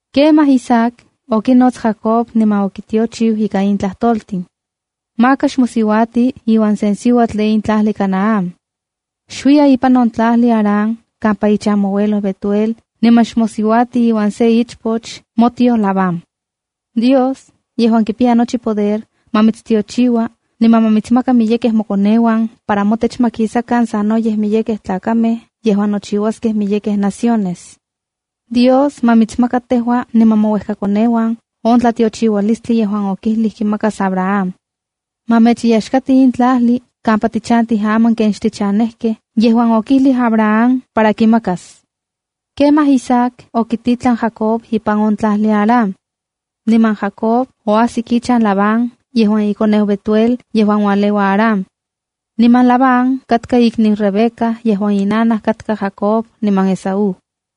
Kemaj Isaac okinots Jacob, niman okitiochiu ikan in tlajtoltin: “Maka xmosiuati iuan sen siuatl de in tlajli Canaán. Xuiya ipan on tlajli Aram kampa ichan moauelo Betuel niman xmosiuati iuan se ichpoch motioj Labán. Dios, yejuan kipiya nochi poder, ma mitstiochiua, niman ma mitsmaka miyekej mokoneuan para motech ma kisakan sanoyej miyekej tlakamej yejuan nochiuaskej miyekej naciones. Dios ma mitsmaka tejua niman mouejkakoneuan on tlatiochiualistli yejuan okijlij kimakas Abraham. Ma mechyaxkati in tlajli kampa tichantij aman ken xchanejkej yejuan okijlij Abraham para kimakas.” Kemaj Isaac okititlan Jacob ipan on tlajli Aram. Niman Jacob oajsik ichan Labán yejuan ikoneu Betuel yejuan ualeua Aram. Niman Labán katka ikniu Rebeca yejuan inanaj katka Jacob niman Esaú.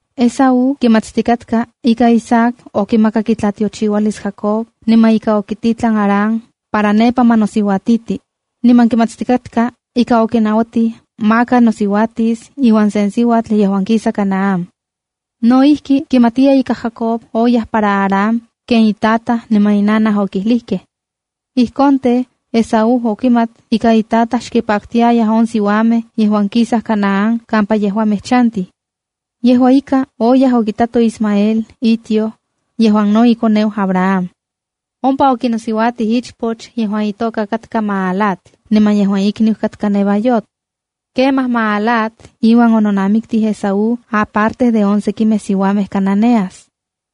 Esaú kimatstikatka ika Isaac okimakak itlatiochiualis Jacob niman ika okititlan Aram para nepa ma nosiuatiti, niman kimatstikatka ika okinauatij maka nosiuatis iuan sen siuatl yejuan kisa Canaán. No ijki, kimatiya ika Jacob oyaj para Aram ken itataj niman inanaj okijlijkej. Ijkon tej, Esaú okimat ika itataj xkipaktiayaj on siuamej yejuan kisaj Canaán kampa yejuamej chantij. Yejua ika, oyaj okitato Ismael on itioj, yejuan no ikoneu Abraham. Ompa okinosiuatij ichpoch yejuan itoka katka Mahalat niman yejuan ikniu katka Nevaiot. Kemaj Mahalat iuan ononamiktij Esaú aparte de on sekimej siuamej cananeas.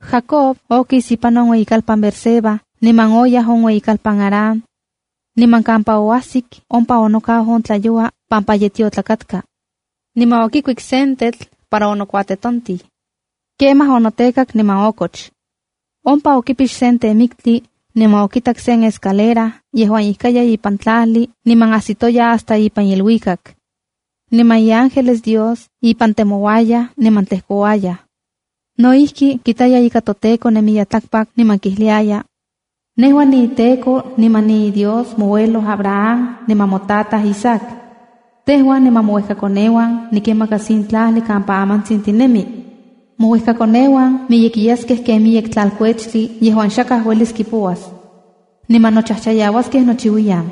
Jacob okis ipan on ueyikalpan Beerseba niman oyaj on ueyikalpan Harán. Niman kampa oajsik ompa onokau on tlayoua pampa ye tiotlak katka. Niman okikuik sen tetl para onokuatetontij. Kemaj onotekak niman okoch. Ompa okipix sen temiktli, niman okitak sen escalera yejuan ijkaya ipan tlajli niman ajsitoya hasta ipan iluikak. Niman iángeles Dios ipan temouayaj niman tlejkouayaj. No ijki, kitaya ika toTEKO nemiya tlakpak, niman kijliaya: “Nejua niinTEKO niman niiDios moauelo Abraham niman motataj Isaac. Tejua niman mouejkakoneuan nikinmakas in tlajli kampa amantsin tinemi. Mouejkakoneuan miyekiyaskej ken miyek tlalteutli yejuan xakaj uelis kipouas. Niman nochajchayauaskej nochiuiyan.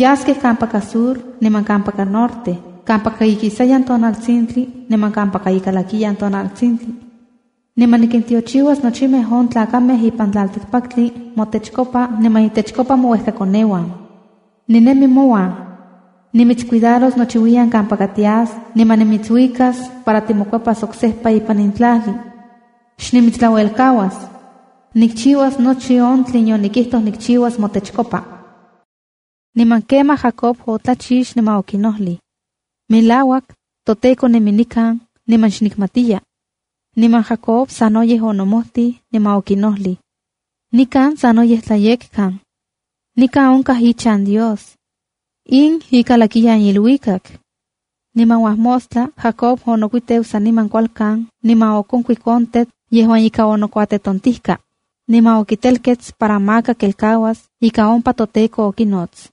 Yaskej kampaka sur niman kampaka norte, kampaka ikisayan tonaltsintli niman kampaka ikalakiyan tonaltsintli. Niman nikintiochiuas nochimej on tlakamej ipan tlaltikpaktli motechkopa niman intechkopa mouejkakoneuan. Ninemi mouan. Nimitscuidaros nochiuiyan kampa tias niman nimitsuijuikas para timokuepas oksejpa ipan in tlajli. Xnimitstlauelkauas. Nikchiuas nochi on tlen yonikijtoj nikchiuas motechkopa.” Niman kemaj Jacob otlachix, niman okinojlij: “Melauak, toTEKO nemi nikan, niman xnikmatiya.” Niman Jacob sanoyej onomojtij, niman okinojlij: “¡Nikan sanoyej tlayekkan! ¡Nikan onkaj ichan Dios! ¡In ikalakiyan iluikak!” Niman uajmostla Jacob onokuiteu saniman kualkan niman okonkuik on tetl yejuan okinokuejtontijka, niman okitelkets para maka kelkauas ika ompa toTEKO okinots.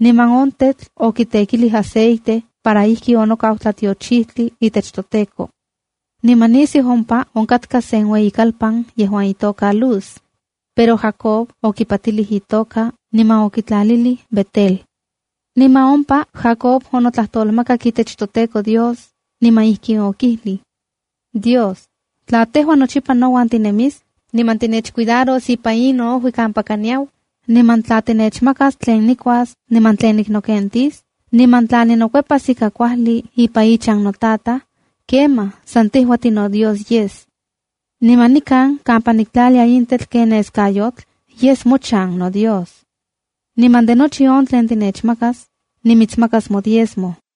Niman on tetl okitekilij aceite para ijki onokau tlatiochijtli itech toTEKO. Niman nisiu ompa onkatka sen ueyikalpan yejuan itoka Luz, pero Jacob okipatilij itoka niman okitlalilij Betela. Niman ompa Jacob onotlajtolmakak itech toTEKO Dios, niman ijkin okijlij: “Dios, tla tejua nochipa nouan tinemis, niman tinechcuidaros ipan in noojui kampaka niyau, niman tla tinechmakas tlen nikuas niman tlen niknokentis, niman tla ninokuepas ika kuajli ipan ichan notataj, kemaj san tejua, tinoDios yes. Niman nikan kampa niktlalia in tetl ken neskayotl, yes mochan noDios. Niman de nochi on tlen tinechmakas, nimitsmakas nodiezmo.”